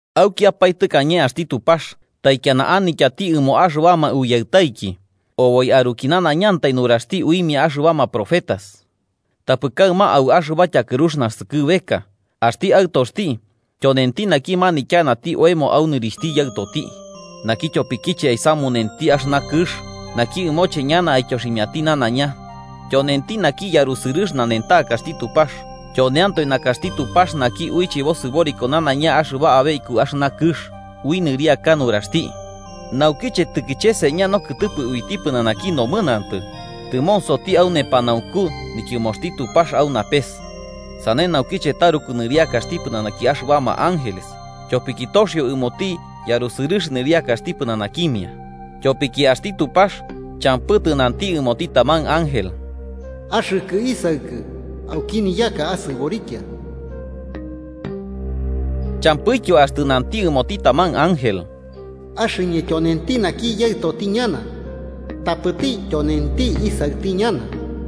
Aukiapae tɨkañe axti Tupax taikiana anityati ɨmoma axɨbama uyaɨtaiki oboi aruki nanaiñantai nuraxti uimia axɨbama profetas. Tapɨ kaɨma au axɨba tyakɨrux naskɨbeka, axti Aɨtoxti tyonenti naki manityanati oemo au nɨrixhti Yaɨtoti, naki tyopikiche aisamunenti axɨna kɨx naki ɨmoche ñana aityoximiati nanaiña. Tyonenti naki yarusɨrɨx nanentakaxti Tupax, tyoneantoe nakaxti Tupax naki uiche bosɨboriko nanaiña axɨba abe iku axɨna kɨx ui nɨriaka nuraxti. Naukiche tɨkicheseña nokɨtɨpɨ uiti pɨnanaki nomɨnantɨ, tɨmonsoti au nepanaunku nityɨmoxti Tupax au napes, sane naukiche taruku nɨriakaxti pɨnanaki axɨbama ángeles, tyopiki toxio ɨmoti yarusɨrɨx nɨriakaxti pɨnanakimia. Tyopiki axti Tupax champɨ tɨnanti ɨmoti taman ángel: “Axɨkɨ Isaɨkɨ. Auki niyaka asɨborikia.” Champɨityo axtɨ nanti ɨmoti taman ángel: “Axɨñɨ tyonenti naki yaɨtoti ñana, tapɨti tyonenti isaɨti ñana.”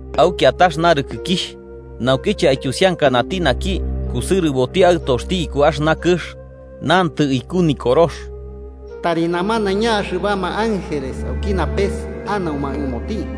Au kiatax narɨkɨkixh, naukiche aityusiankanati naki kusɨrɨboti Aɨtoxti iku axɨna kɨx, nantɨ iku Nikorox: “Tari namanaiña axɨbama ángeles auki napes anauma ɨmoti.”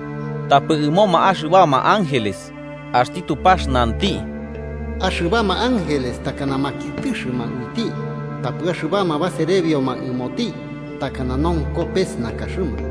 Tapɨ ɨmoma axɨbama ángeles axti Tupax nanti: “Axɨbama ángeles takana makiɨtɨxɨma uiti, tapɨ axɨbama baserebioma ɨmoti takana nonko pes nakaxɨma.”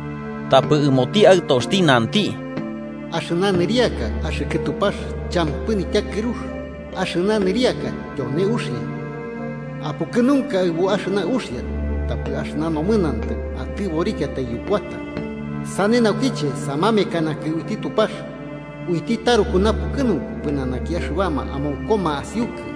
Tapɨ ɨmoti Aɨtoxti nanti: “Axɨna nɨriaka, axɨkɨ Tupax, champɨ nityakɨrux, axɨna nɨriaka tyone uxia. Apukɨnunka aɨbu axɨna uxia tapɨ axɨba nomɨnantɨ atɨborikiatai yukuata. Sane naukiche samamekanakɨ uiti Tupax, uiti taruku napukɨnunku pɨnanaki axɨbama amonkoma asiukɨ.”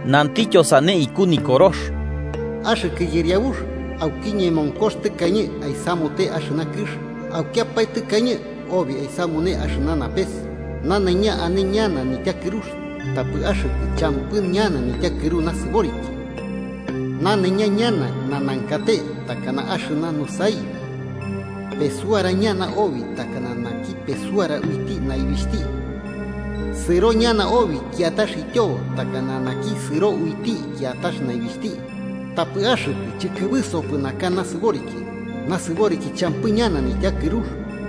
Nantɨtyo sane iku Nikorox: “Axɨkɨ Yɨriabux, auki ñemonkox tɨkañe aisamute axɨna kɨx, aukiapae tɨkañe obi aisamune axɨna napes. Nanaiña ane ñana niyutakɨrux, tapɨ axɨkɨ champɨ ñana nityakɨru nasɨboriki. Nanaiña ñana nanankate takana axɨna nusaibi. ¡Pesuara ñana obi takanati naki pesuara uiti naibixhti, sɨro ñana obi kiatax ityobo takanati naki sɨro uiti kiatax naibixhti! Tapɨ axɨkɨ chɨkɨbɨsopɨ naka nasɨboriki. Nasɨboriki champɨ ñana nityakɨrux.”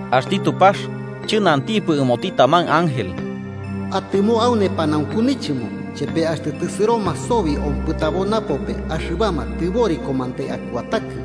“Axti Tupax chɨnantipɨ ɨmoti taman ángel: Atɨmo au nepanaunku nichɨmo, chepe axtɨ tɨsɨroma sobi ompɨtabo napope axɨbama tɨborikomantai akuatakɨ.”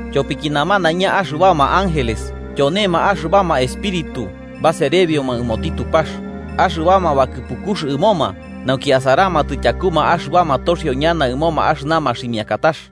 Tyopiki namanaiña axɨbama ángeles tyonema axɨbama espíritu baserebioma ɨmoti Tupax, axɨbama bakɨpukux ɨmoma nauki asaramatɨ tyakuma axɨbama toxio ñana ɨmoma axɨna maximiakatax.